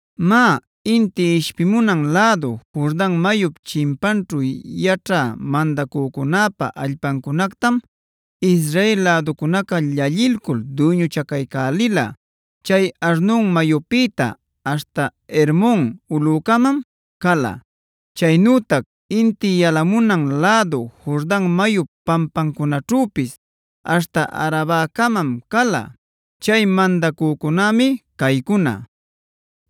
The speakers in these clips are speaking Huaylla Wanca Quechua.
Má, inti ishpimunan lädu Jordan mayup chimpanćhu yaćhä mandacücunäpa allpancunactam Israel läducunaca llallilcul duyñuchacaycälila. Chay Arnon mayupïta aśhta Hermon ulücamam cala; chaynütac inti yalamunan lädu Jordan mayup pampancunaćhüpis aśhta Arabacamam cala. Chay mandacücunämi caycuna: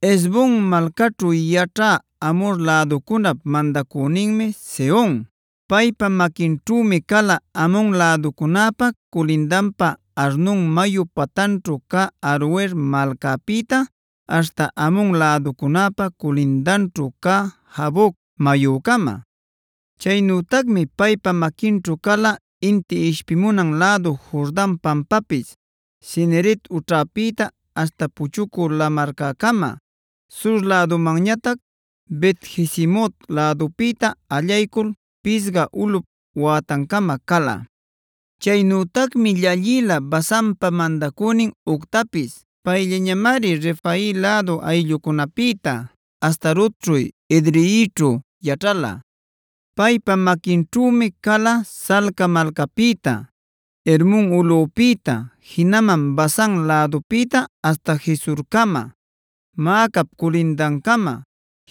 Hesbon malcaćhu yaćhä Amhor läducunap mandacüninmi Sehon; paypa maquinćhümi cala Amon läducunäpa culindanpa Arnon mayu patanćhu cä Aroer malcapïta aśhta Amon läducunäpa culindanćhu cä Jaboc mayucama. Chaynütacmi paypa maquinćhu cala, inti ishpimunan lädu Jordan pampapis Cineret ućhapïta aśhta Puchucü Lamarcäcama; sur lädumanñatac Bet-jesimot lädupïta allaycul Pisga ulꞌup wätancama cala. Chaynütacmi llallila Basanpa mandacünin Ogtapis. Payllañamari Refai lädu ayllucunapïta, Astarotćhu, Edreićhu yaćhala. Paypa maquinćhümi cala Salca malcapïta, Hermon ulꞌupïta, jinaman Basan lädupïta aśhta Gesurcama, Maacap culindancama,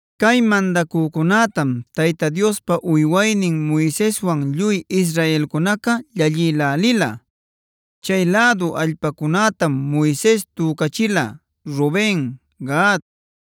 Cay mandacücunätam Tayta Diospa uywaynin Moiseswan lluy israelcunaca llallïlälila. Chay lädu allpacunätam Moises tücachila Ruben, Gad,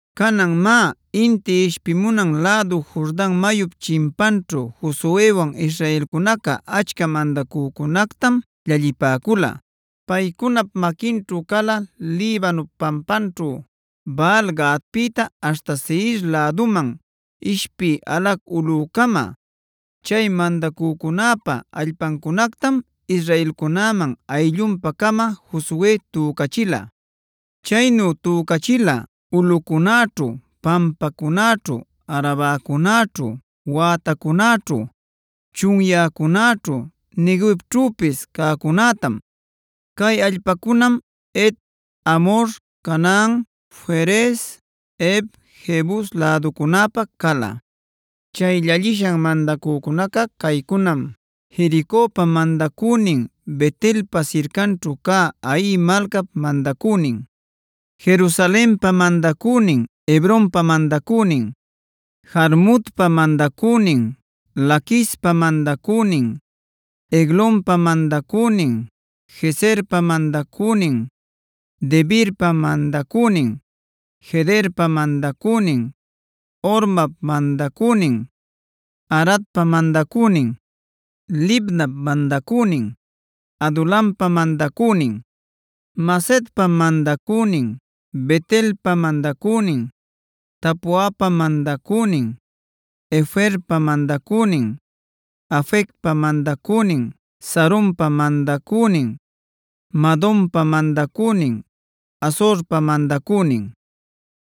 Canan má, inti ishpimunan lädu Jordan mayup chimpanćhu Josuewan israelcunaca achca mandacücunactam llallipäcula. Paycunap maquinćhu cala Libanop pampanćhu Baal-gaadpïta aśhta Seir läduman ishpï Halac ulꞌucama. Chay mandacücunäpa allpacunactam israelcunäman ayllunpa-cama Josue tücachila. Chaynu tücachila: ulꞌucunäćhu, pampacunäćhu, Arabacunäćhu, wätacunäćhu, chunyäcunäćhu, Neguevćhüpis cäcunätam. Cay allpacunam Het, Amhor, Canaan, Ferez, Hev, Jebus läducunäpa cala. Chay llallishan mandacücunaca caycunam: Jericopa mandacünin, Bet-elpa sircanćhu cä Hai malcap mandacünin, Jerusalenpa mandacünin, Hebronpa mandacünin, Jarmutpa mandacünin, Laquispa mandacünin, Eglonpa mandacünin, Gezerpa mandacünin, Debirpa mandacünin, Gederpa mandacünin, Hormap mandacünin, Aradpa mandacünin, Libnap mandacünin, Adulampa mandacünin, Macedap mandacünin, Bet-elpa mandacünin, Tapuapa mandacünin, Heferpa mandacünin, Afecpa mandacünin, Saronpa mandacünin, Madonpa mandacünin, Hazorpa mandacünin,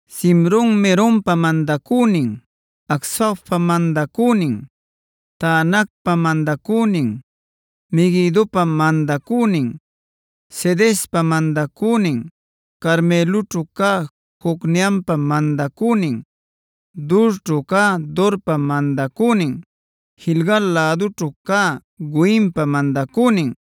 Simron-meronpa mandacünin, Acsafpa mandacünin, Taanacpa mandacünin, Meguidopa mandacünin, Cedespa mandacünin, Carmeloćhu cä Jocneampa mandacünin, Dorćhu cä Dorpa mandacünin, Gilgal lädućhu cä Goimpa mandacünin,